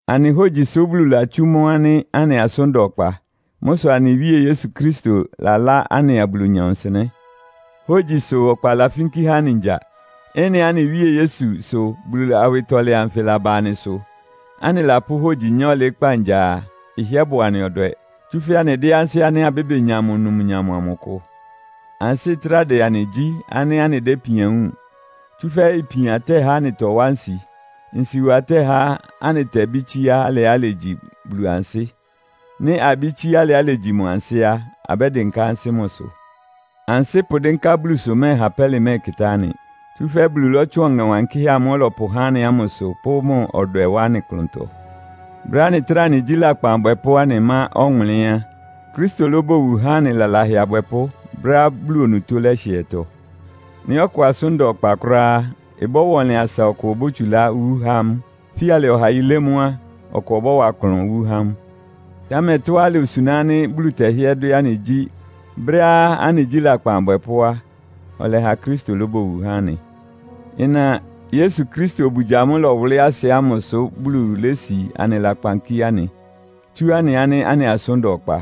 Anɩ hógyi sʋ́ Bulu latsú mʋ́ ánɩ́ anɩ asʋ́n da ɔkpa. Mʋ́ sʋ anɩ Wíe Yesu Kristo lalá anɩa Bulunyɔ nsɩnɛ́. Hógyi sʋ ɔkpa lafínkí há anɩ ngya. Ɩ́nɩá anɩ Wíe Yesu sʋ́ Bulu awɩtɔlɛ anfɩ laba anɩsʋ, anɩlapʋ́ hogyi nyá ɔlɩɩ́kpá ngya a, ɩhɩ́ɛ́ bʋ anɩ ɔdwɛ. Tsúfɛ́ anɩdɩ́n ansɩ́ ánɩ́ abébenya mʋ numnyam amʋ kʋ. Ansɩ́ ɩtráa dɛ anɩ gyí ánɩ́ anɩdɛ́ ipian wúun. Tsúfɛ́ ipian tɛ́há anɩtɔwá nsi. Nsiwa tɛhá anɩtɛbɩ́ tsíá alɩá ilegyi Bulu ansɩ́. Nɩ́ abɩ́ tsíá alɩá ilegyi mʋ ansɩ́ á, abɛ́dɩnká ansɩ́ mʋsʋ. Ansɩ́ pʋdɩ́nká Bulusʋ mɛ́ɛha pɛ́lɩ mɛ́ɛkɩtá anɩ. Tsúfɛ́ Bulu lɔ́tsʋn Ɔŋɛ Wankɩ́hɛ́ amʋ́ʋ́ ɔlɔpʋhá anɩ ámʋsʋ pʋ́ mʋ ɔdwɛ wá anɩ klʋntɔ. Brɛ́á anɩtráa anɩgyí lakpan abwɛpʋ́, anɩmá ɔwʋnlɩ́n á, Kristo lóbowu há anɩ lalahɛ abwɛpʋ́ brɛ́á Bulu onutó lɛ́hɩɛtɔ. Nɩ́ ɔkʋ asʋ́n da ɔkpa kʋ́ráá á, ɩbɔ́wa ɔnlɩn asa ɔkʋ obótsulá wú há mʋ. Fíalɩ ɔha yilé mʋ́ á, ɔkʋ ɔbɔ́wa klʋn wú há mʋ. Támɛ tɔ́á ilosuná ánɩ́ Bulu tɛhɩ́ɛ́ dwɛ́ anɩ gyí, brɛ́á anɩgyí lakpan abwɛpʋ́ á, ɔlɛha Kristo lóbowu há anɩ. Ɩna Yesu Kristo obugya amʋ́ʋ́ ɩlɔwʋlɩ́ asɩ ámʋsʋ Bulu lési anɩ lakpan kíé anɩ, tsú anɩ ánɩ́ anɩ asʋ́n da ɔkpa.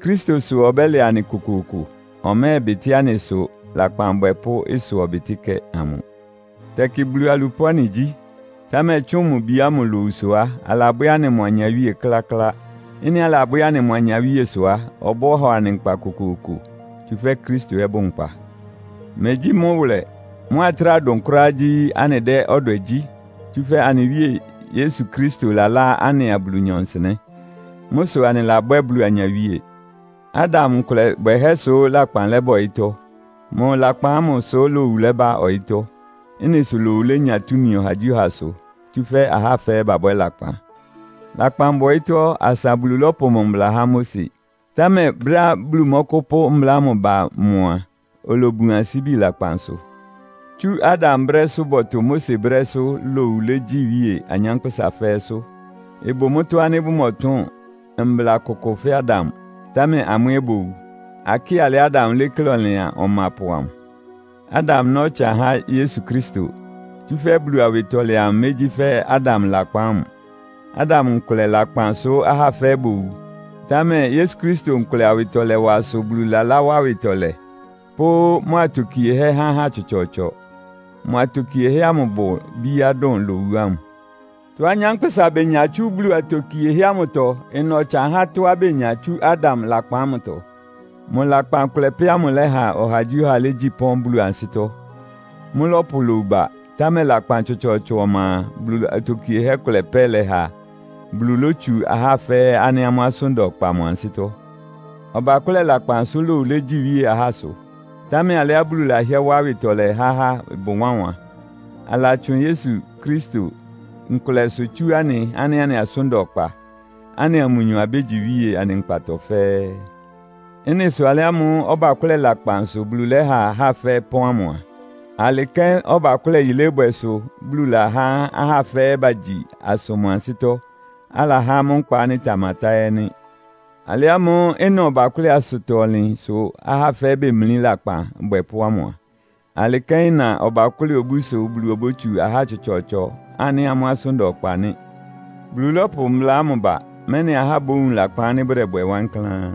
Kristo sʋ ɔbɛ́lɛ anɩ kokooko. Ɔmɛ́ɛbɩtɩ́ anɩ ɩsʋ lakpan abwɛpʋ́ ɩsʋ-ɔbɩtɩ́kɛ́ amʋ. Tɛkɩ Bulu alupʋ́ anɩgyí. Támɛ tsʋ́ʋn mʋ Bi ámʋ lowusʋ á, alabwɛ́ anɩ mʋ anyawíe kláklá. Ɩ́nɩá anɩlabwɛ́ mʋ anyawíe sʋ á, ɔbɔ́hɔ anɩ nkpa kokooko. Tsúfɛ́ Kristo ɛ́ bʋ nkpa. Megyí mʋ́ wʋlɛ. Mʋ́á ɩtráa dʋn kʋ́ráá gyí, anɩdɛ́ ɔdwɛ gyí. Tsúfɛ́ anɩ Wíe Yesu Kristo lalá anɩa Bulunyɔ nsɩnɛ́. Mʋ́ sʋ anɩlabwɛ́ Bulu anyawíe. Adam nkʋlɛ bwɛhɛ́ sʋ lakpan lɛ́ba ɔyɩ́tɔ́. Mʋ lakpan ámʋ sʋ́ lowu lɛ́ba ɔyɩ́tɔ́. Ɩ́nɩ sʋ lowu lénya túmi ɔhagyíɔhasʋ, tsúfɛ́ ahá fɛ́ɛ́ babwɛ́ lakpan. Lakpan bʋ ɔyɩ́tɔ́ asa Bulu lɔ́pʋ mʋ mbla ba Mose. Támɛ brɛ́á Bulu mɔ́kʋ́pʋ́ mbla ámʋ ba mʋ a, olobun ansíbi lakpansʋ. Tsú Adam brɛ́sʋ́ bɔtʋ Mose brɛ́sʋ́ lowu legyi iwíe anyánkpʋ́sa fɛ́ɛ́sʋ́. Ɩbʋ mʋ́tɔ́ ánɩ́ bʋmɔtʋn mbla kʋkʋ fɛ́ Adam, támɛ amʋ́ ɛ́ bowu. Akɩ́ɩ alɩá Adam léklé ɔlɩan ɔmapʋ amʋ. Adam ná ɔtsan há Yesu Kristo. Tsúfɛ́ Bulu awɩtɔlɛ amʋ megyí fɛ́ Adam lakpan ámʋ. Adam nkʋlɛ lakpan sʋ́ ahá fɛ́ɛ́ bowu. Támɛ Yesu Kristo nkʋlɛ awɩtɔlɛwa sʋ Bulu laláwá awɩtɔlɛ, pʋ́ mʋ atokiehɛ́ há ahá tsɔtsɔɔtsɔ. Mʋ atokiehɛ́ ámʋ ɩbʋ bíá dʋn lowu ámʋ. Tɔ́á anyánkpʋ́sa benya tsú Bulu atokiehɛ́ ámʋtɔ ɩna ɔtsan há tɔ́á benya tsú Adam lakpan ámʋtɔ. Mʋ lakpan kʋlɛ pɛ́ amʋ lɛ́ha ɔhagyíɔha légyi pɔ́n Bulu ansɩ́tɔ́. Mʋ́lɔ́pʋ lowu ba, támɛ lakpan tsɔtsɔɔtsɔ ɔma a, Bulu atokiehɛ́ kʋlɛ pɛ́ lɛha Bulu lótsu ahá fɛ́ɛ́ ánɩ́ amʋ́ asʋ́n da ɔkpa mʋ ansɩ́tɔ́. Ɔbakʋ́lɛ lakpan sʋ lowu légyi iwíe ahásʋ. Támɛ alɩá Bulu lahɩ́ɛ́ wá awɩtɔlɛ há ahá ɩbʋ wánwan. Alatsʋn Yesu Kristo nkʋlɛsʋ tsú anɩ ánɩ́ anɩ asʋ́n da ɔkpa, anɩa mʋnyɔ abégyi iwíe anɩ nkpatɔ fɛ́ɛ́. Ɩ́nɩ sʋ alɩ ámʋ́ʋ́ ɔbakʋ́lɛ lakpan sʋ Bulu lɛ́ha ahá fɛ́ɛ́ pɔ́n ámʋ a, alɩ kɛ́n ɔbakʋ́lɛ yilébwɛ sʋ Bulu lahá ahá fɛ́ɛ́ bagyi asʋ mʋ ansɩ́tɔ́, alahá amʋ́ nkpa ánɩ́ ɩtamatá ɛ́ nɩ́. Alɩ ámʋ́ʋ́ ɩna ɔbakʋ́lɛ asʋtɔ-ɔnlɩn sʋ ahá fɛ́ɛ́ bemlí lakpan abwɛpʋ́ ámʋ a, alɩ kɛ́n ɩna ɔbakʋ́lɛ obú sʋ Bulu obótsu ahá tsɔtsɔɔtsɔ ánɩ́ amʋ́ asʋ́n da ɔkpa nɩ́. Bulu lɔ́pʋ mbla ámʋ ba, mɛ́nɩ ahá bówun lakpan ánɩ́ bʋdɛbwɛ wankláán.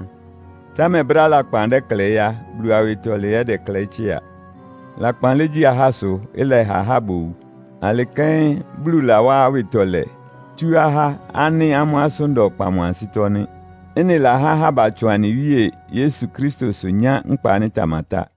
Támɛ brɛ́á lakpan dɛ́klɛɩ́ á, Bulu awɩtɔlɛ ɛ́ ɩdɛklɛɩ́ tsɩ́a. Lakpan légyi ahásʋ, ɩlɛha ahá bowu. Alɩ kɛ́n Bulu lawá awɩtɔlɛ tsú ahá ánɩ́ amʋ́ asʋ́n da ɔkpa mʋ ansɩ́tɔ́ nɩ́. Ɩ́nɩ lahá ahá batsʋn anɩ Wíe Yesu Kristosʋ nyá nkpa ánɩ́ ɩtamatá.